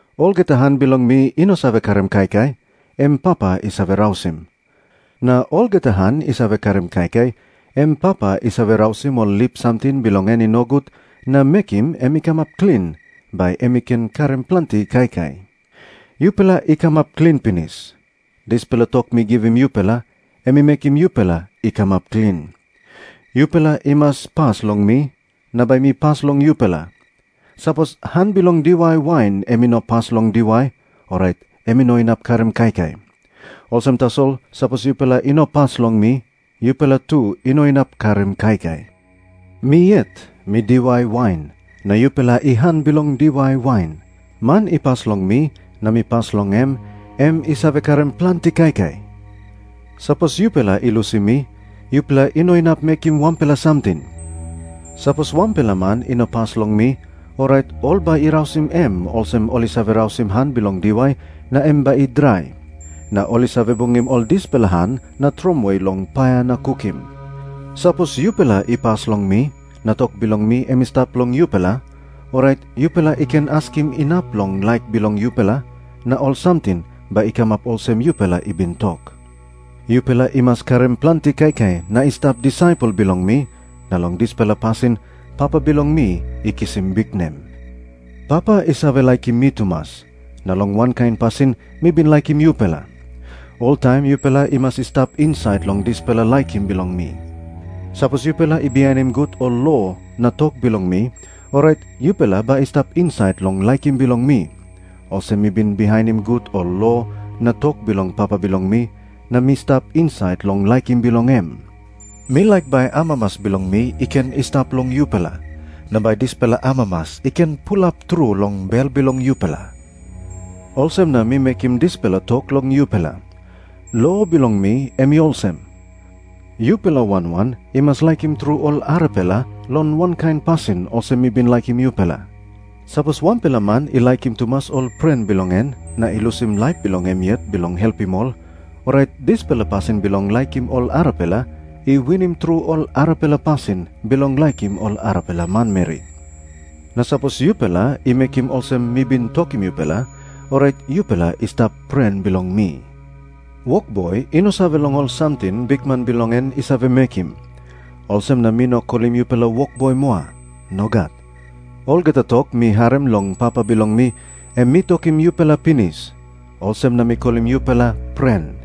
Olgeta han bilong mi i no save karim kaikai, em Papa i save rausim. Na olgeta han i save karim kaikai, em Papa i save rausim ol lip samting bilong en i nogut, na mekim em i kamap klin, bai em i ken karim planti kaikai. Yupela i kamap klin pinis. Dispela tok mi givim yupela, em i mekim yupela i kamap klin. Yupela i mas pas long mi, na bai mi pas long yupela. Sapos han bilong diwai wain em i no pas long diwai, orait em i no inap karim kaikai. Olsem tasol, sapos yupela i no pas long mi, yupela tu i no inap karim kaikai. “Mi yet mi diwai wain, na yupela i han bilong diwai wain. Man i pas long mi na mi pas long em, em i save karim planti kaikai. Sapos yupela i lusim mi, yupela i no inap mekim wanpela samting. Sapos wanpela man i no pas long mi, orait ol bai i rausim em olsem ol i save rausim han bilong diwai, na em bai i drai. Na ol i save bungim ol dispela han na tromoi long paia na kukim. “Sapos yupela i pas long mi, na tok bilong mi em i stap long yupela, orait yupela i ken askim inap long laik bilong yupela, na ol samting bai i kamap olsem yupela i bin tok. Yupela i mas karim planti kaikai na i stap disaipel bilong mi, na long dispela pasin Papa bilong mi i kisim biknem. Papa i save laikim mi tumas, na long wankain pasin mi bin laikim yupela. Oltaim yupela i mas i stap insait long dispela laikim bilong mi. Sapos yupela i bihainim gut ol lo na tok bilong mi, orait yupela bai i stap insait long laikim bilong mi, olsem mi bin bihainim gut ol lo na tok bilong Papa bilong mi, na mi stap insait long laikim bilong em. Mi laik bai amamas bilong mi i ken i stap long yupela, na bai dispela amamas i ken pulap tru long bel bilong yupela. Olsem na mi mekim dispela tok long yupela. Lo bilong mi em i olsem. Yupela wan wan i mas laikim tru ol arapela, long wankain pasin olsem mi bin laikim yupela. Sapos wanpela man i laikim tumas ol pren bilong en na i lusim laip bilong em yet bilong helpim ol, orait dispela pasin bilong laikim ol arapela i winim tru ol arapela pasin bilong laikim ol arapela manmeri. Na sapos yupela i mekim olsem mi bin tokim yupela, orait yupela i stap pren bilong mi. Wokboi i no save long ol samting bikman bilong en i save mekim. Olsem na mi no kolim yupela ‘wokboi’ moa. Nogat. Olgeta tok mi harim long Papa bilong mi, em mi tokim yupela pinis. Olsem na mi kolim yupela ‘pren.’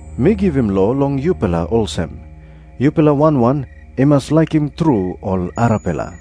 Mi givim lo long yupela olsem. Yupela wan wan i mas laikim tru ol arapela.”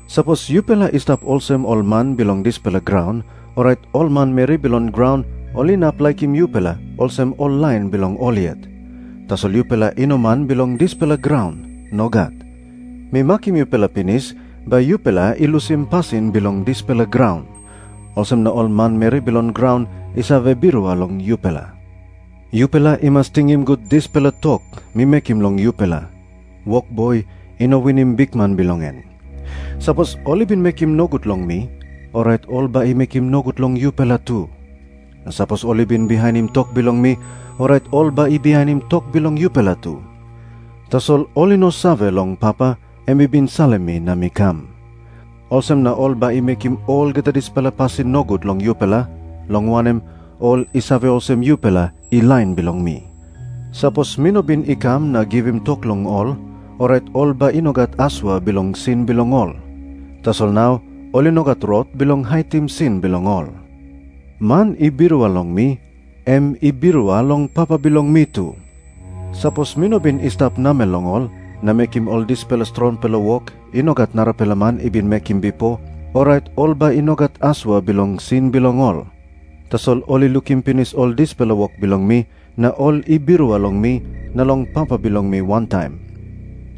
Sapos yupela i stap olsem ol man bilong dispela graun, orait ol manmeri bilong graun ol inap laikim yupela olsem ol lain bilong ol yet. Tasol yupela i no man bilong dispela graun. Nogat. Mi makim yupela pinis bai yupela i lusim pasin bilong dispela graun. Olsem na ol manmeri bilong graun i save birua long yupela. Yupela i mas tingim gut dispela tok mi mekim long yupela. Wokboi i no winim bikman bilong en. Sapos ol i bin mekim nogut long mi, orait ol bai i mekim nogut long yupela tu. Na sapos ol i bin bihainim tok bilong mi, orait ol bai i bihainim tok bilong yupela tu. Tasol ol i no save long Papa, em i bin salim mi na mi kam. Olsem na ol bai i mekim olgeta dispela pasin nogut long yupela, long wanem, ol i save olsem yupela i lain bilong mi. “Sapos mi no bin i kam na givim tok long ol, orait ol bai i no gat asua bilong sin bilong ol. Tasol nau ol i no gat rot bilong haitim sin bilong ol. Man i birua long mi, em i birua long Papa bilong mi tu. Sapos mi no bin i stap namel long ol na mekim ol dispela strongpela wok i no gat narapela man i bin mekim bipo, orait ol bai i no gat asua bilong sin bilong ol. Tasol ol i lukim pinis ol dispela wok bilong mi, na ol i birua long mi na long Papa bilong mi wantaim.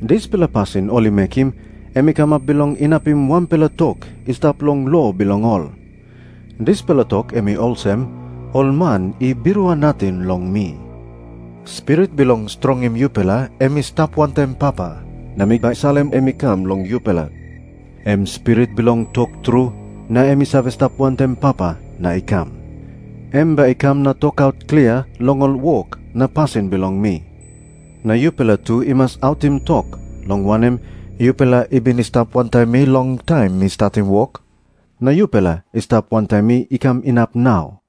Dispela pasin ol i mekim, em i kamap bilong inapim wanpela tok i stap long lo bilong ol. Dispela tok em i olsem, ‘Ol man i birua nating long mi.’ “Spirit bilong strongim yupela em i stap wantaim Papa, na mi bai salim em i kam long yupela. Em Spirit bilong tok tru, na em i save stap wantaim Papa na i kam. Em bai i kam na tokaut klia long ol wok na pasin bilong mi. Na yupela tu i mas autim tok, long wanem, yupela i bin i stap wantaim mi long taim mi statim wok, na yupela i stap wantaim mi i kam inap nau.